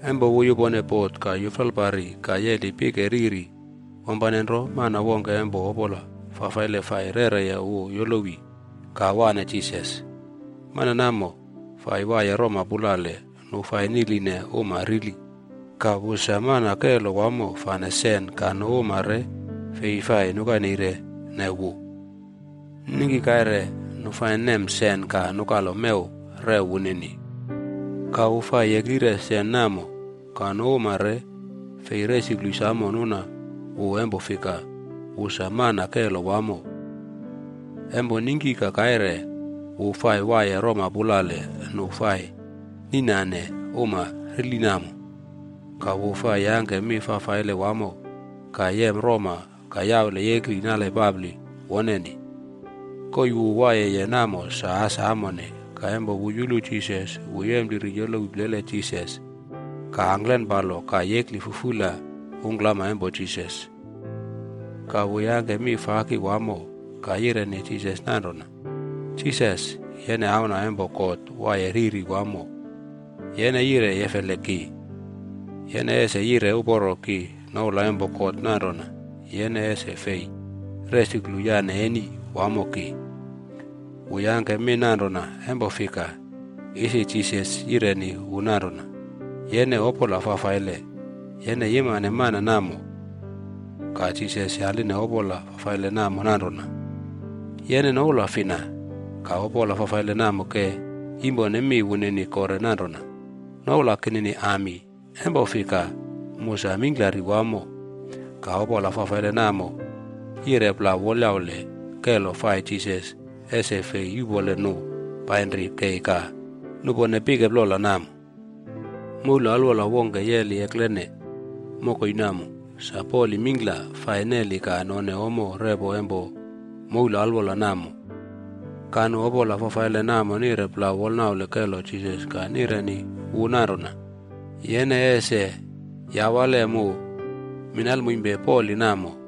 Empo wu yupone bot ka yuflalpari ka yeli pike riri, wampane nro mana wongke empo opola fafaile fai rereye wu yolowi ka wane Jisas. Mana namo fai waiye roma pulale nu fai niꞌline uma rili. Ka wu sa mana kelo wamo fane sen ka nu uma re fei fai nukaneirene wu. Ningki kaire nu fai nemne sen ka nukalo mew rew wunini. Ka wu fai yeklire sen namo. Ka nu uma re fei resuklu samo nuna wu empo fika, wu sa mana kelo wamo. Empo ningki ka kaire, wu fai waiye roma pulale nu fai niꞌnane uma rili namo. Ka wu fai yangke mi fafaile wamo ka yem roma ka yaule yekli nale papli woneni. Koii wu waiyeye namo sa as amone. Ka empo wu yulu Jisas, wu yempliri yolowi plele Jisas ka angklenpalo ka yekli fufula ungklama empo Jisas. Ka wu yangke mi faki wamo ka yireni Jisas nanrona, “Jisas, yene Auna empo God Waiye Riri Wamo. Yene yire yefele ki? Yene ese yire uporo ki noula empo God nanrona yene ese fei resuklu yane eni wamo ki!” Wu yangke mi nanrona empo fika, isi Jisas yireni wu nanrona, “Yene opola fafaile. Yene yimane mana namo.” Ka Jisas yaline opola fafaile namo nanrona, “Yene noula fina?” Ka opola fafaile namo ke yimpone mi wunini kore nanrona, “Noula kinini Ami. Empo fika, mu sa mingklari wamo.” Ka opola fafaile namo yire plau wolyaule kelo fai Jisas ese fei yuꞌpole nu painri kei ka nupone pike plola namo. Moule alwola wongke yeli eklene mokoi namo. Sa poli mingkla fai neli ka none ommo repo empo moul alwola namo. Ka nu opola fafaile namo nire plau wolnaule kelo Jisas ka nireni wu nanrona, “Yene ese yawale mu minalmoimpe poli namo.”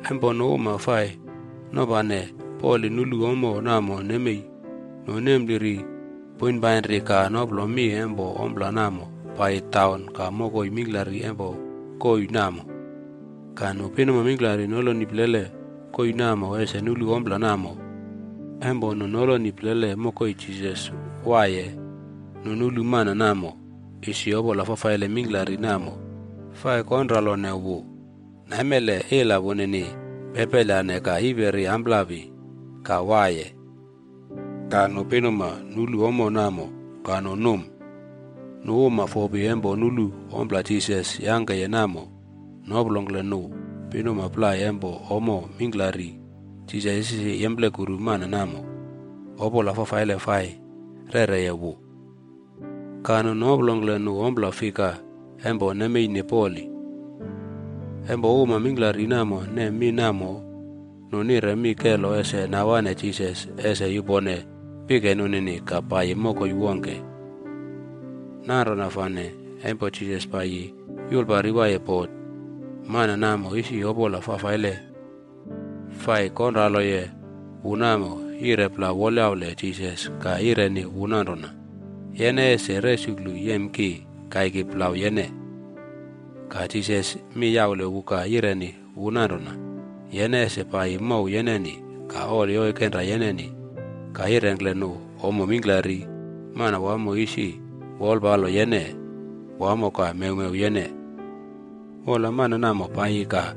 Empo nu uma fai nopane poli nulu ommo namo nemei, nu nempliri poinpainri ka noplo mi empo ompla namo paiyi taun ka mokoi mingklari empo koii namo. Ka nu pinuma mingklari noloni plele koii namo ese nulu ompla namo. Empo nu noloni plele mokoi Jisas waiye, nu nulu mana namo, isi opola fafaile mingklari namo fai konralone wu. Naimele ila wunini pepelyane ka yiperi amplapi ka waiye. Ka nu pinuma nulu ommo namo ka nu num. Nu uma fopi empo nulu ompla Jisas yangkeye namo noplongkle nu pinuma plai empo ommo mingklari Jisas isi yemplekuru mana namo opola fafaile fai rereye wu. Ka nu noplongkle nu ompla fika empo nemeine poli. Empo uma mingklari namo nem mi namo, nu nire mi kelo ese nawane Jisas ese yupone pike nunini ka paiyi mokoi wongke. Nanrona fane empo Jisas paiyi yulpari waiye bot, mana namo isi opola fafaile fai konraloye wu namo, yire plau wolyaule Jisas ka yireni wu nanrona, “Yene ese resuklu yem ki kaiki plau yene?” Ka Jisas mi yaule wu ka yireni wu nanrona, “Yene ese paiyi mow yeneni ka oli oikenra yeneni ka yirengkle nu ommo mingklari Manawamo isi wolpalo yene wamo ka mewmew yene.” Wola, mana namo paiyi ka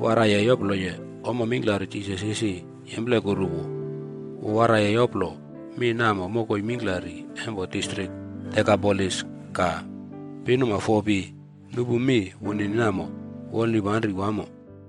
waraiye yoploye ommo mingklari Jisas isi yemplekuru wu. Wu waraiye yoplo mi namo mokoi mingklari empo distrik Dekapolis.a Ka pinuma fopi nupu mi wunini namo wolnipanri wamo.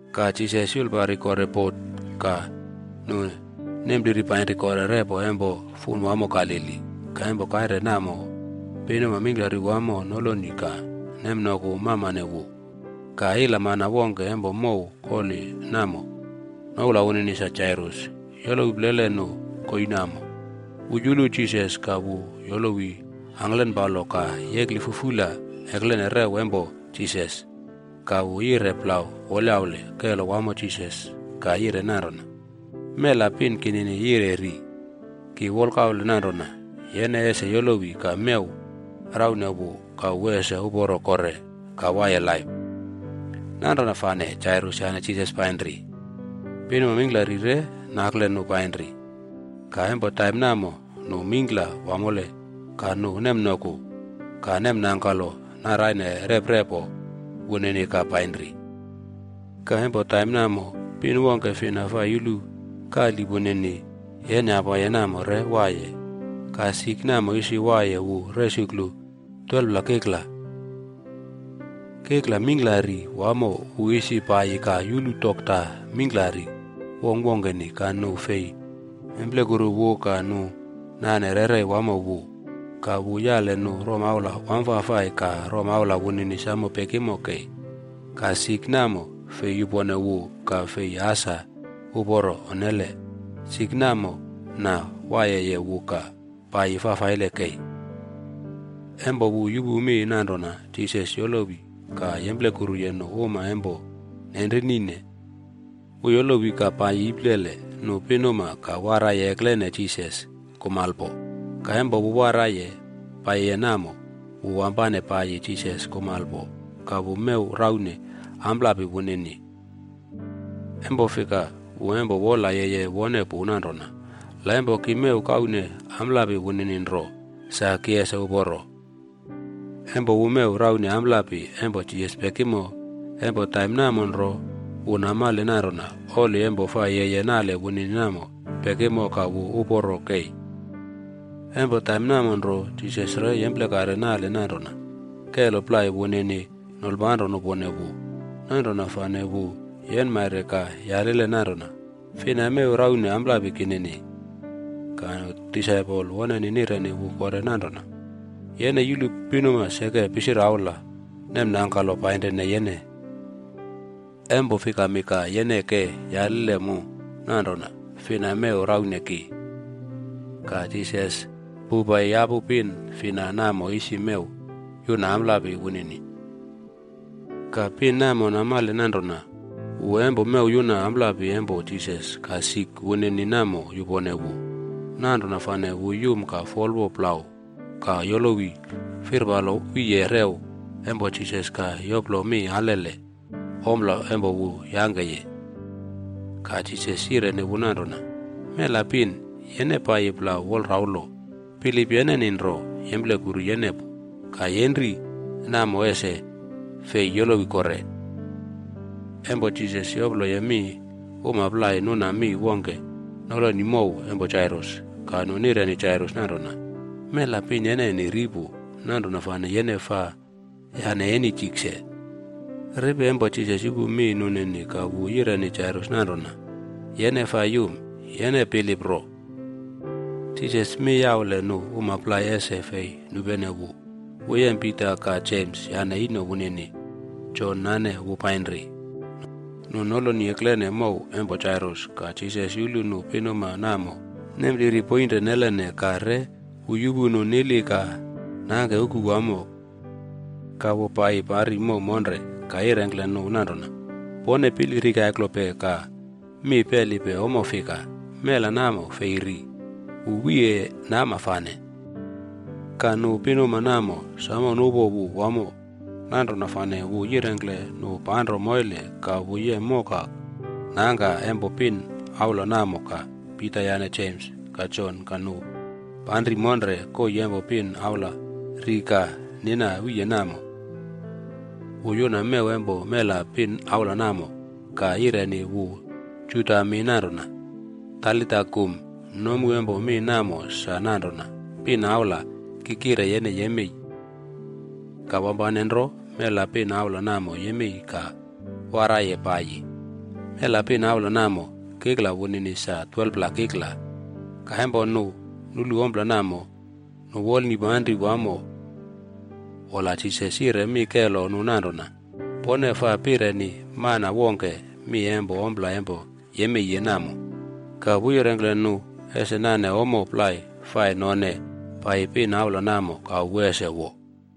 Ka Jisas yulpari kore bot ka nu nempliri painri kore repo empo fun wamo Galili. Ka empo kaire namo, pinuma mingklari wamo noloni ka nemnoku mamane wu. Ka ilamana wongke empo mow koli namo noula wunini sa Jairus yolowi plele nu koii namo. Wu yulu Jisas ka wu yolowi angklenpalo ka yekli fufula eklene rew empo Jisas. Ka wu yire plau wolyaule kelo wamo Jisas ka yire nanrona, “Mela pin kinini yire ri. Ki wolkaule nanrona yene ese yolowi ka mew raune wu ka wu ese uporo kore ka waiye laip.” Nanrona fane, Jairus yane Jisas painri. Pinuma mingklari re nakle nu painri. Ka empo taim namo nu mingkla wamole ka nu nemnoku ka nemnangkalo naraine reprepo wunini ka painri. Ka empo taim namo, pin wongke fina fai yulu kali wunini yenyapaye namo re waiye. Ka sik namo isi waiye wu resuklu 12pla kikla. Kikla mingklari wamo wu isi paiyi ka yulu dokta mingklari wongkwongkeni ka nu fei nemplekuru wu ka nu nane rerei wamo wu. Ka wu yale nu romaula wamfafai ka romaula wunini samo pekimo kei. Ka sik namo fei yupone wu ka fei asa uporo, onnele. Sik namo nawaiyeye wu ka paiyi fafaile kei. Empo wu yupu mi nanrona Jisas yolowi ka yemplekuruye nu uma empo nenrinine, wu yolowi ka paiyi iplele nu pinuma ka waraiye eklene Jisas kumalpo. Ka empo wu waraiye paiyiye namo, wu wampane paiyi Jisas kumalpo ka wu mew raune amplapi wunini. Empo fika wu empo wola yeye wone pu nanrona, “La empo ki mew kaune amplapi wunini nro, sa ki ese uporo.” Empo wu mew raune amplapi empo Jisas pekimo, empo taim namo nro, wu namale nanrona oli empo fai yeye nale wunini namo pekimo ka wu uporo kei. Empo taim namo nro, Jisas re yemplekare nale nanrona kelo plai wunini nolpanro nupone wu. Nanrona fane wu yenmaire ka yalile nanrona, “Fina mew raune amplapi kinini?” Ka nu disaipol woneni nireni wu kore nanrona, “Yene yulu pinuma seke pisiraula nemnangkalo painrine yene. Empo fikami ka yene ke yaline mu nanrona, ‘Fina mew raune ki?’” Ka Jisas pouwpai yapu pin fina namo isi mew yuna amplapi wunini. Ka pin namo namale nanrona wu empo mew yuna amplapi empo Jisas ka sik wunini namo yupone wu. Nanrona fane wu yum ka folwo plau ka yolowi firpalo wiye rew empo Jisas ka yoplo mi alele ompla empo wu yangkeye. Ka Jisas yireni wu nanrona, “Mela pin, yene paiyi plau wolraulo. Bilip yeneni nro yemplekuru yene pu ka yenri namo ese fei yolowi kore.” Empo Jisas yoploye mi, uma plai nuna mi wongke noloni mow empo Jairus. Ka nu nireni Jairus nanrona, “Mela pin yeneni ri pu. Nanrona fane yene faa yane eni tikse.” Ripi empo Jisas yupu mi nunini ka wu yireni Jairus nanrona, “Yene faa yum. Yene bilip nro.” Jisas mi yaule nu uma plai ese fei nupene wu. Wu yem Pita ka Jems yane ino wunini, Jon nane wu painri. Nu noloni eklene mow empo Jairus ka Jisas yulu nu pinuma namo nempliri poinre nelene ka re wu yupu nu nili ka nangke uku wamo. Ka wu pai pari mow monre ka yirengkle nu nanrona, “Pone pili rikaiklope ka mi pelipe ompla fika? Mela namo fei ri, wu wiye nama fane.” Ka nu pinuma namo samo nupo wu wamo. Nanrona fane wu yirengkle nu panro moile ka wu yem moka nangka empo pin aula namo ka Pita yane Jems ka Jon ka nu panri monre koii empo pin aula ri ka nina wiye namo. Wu yuna mew empo mela pin aula namo ka yireni wu Juda mi nanrona, “Talita kum.” Nomu empo mi namo sa nanrona, “Pin aula, ki kire yene yemei.” Ka wampane nro mela pin aula namo yemei ka waraiye paiyi. (Mela pin aula namo, kikla wunini sa 12pla kikla.) Ka empo nu nulu ompla namo, nu wolnipanri wamo. Wola Jisas yire mi kelo nu nanrona, “Pone faa pireni mana wongke mi empo ompla empo yemeiye namo.” Ka wu yirengkle nu ese nane ommo plai fai none paiyi pin aula namo ka wu ese wo.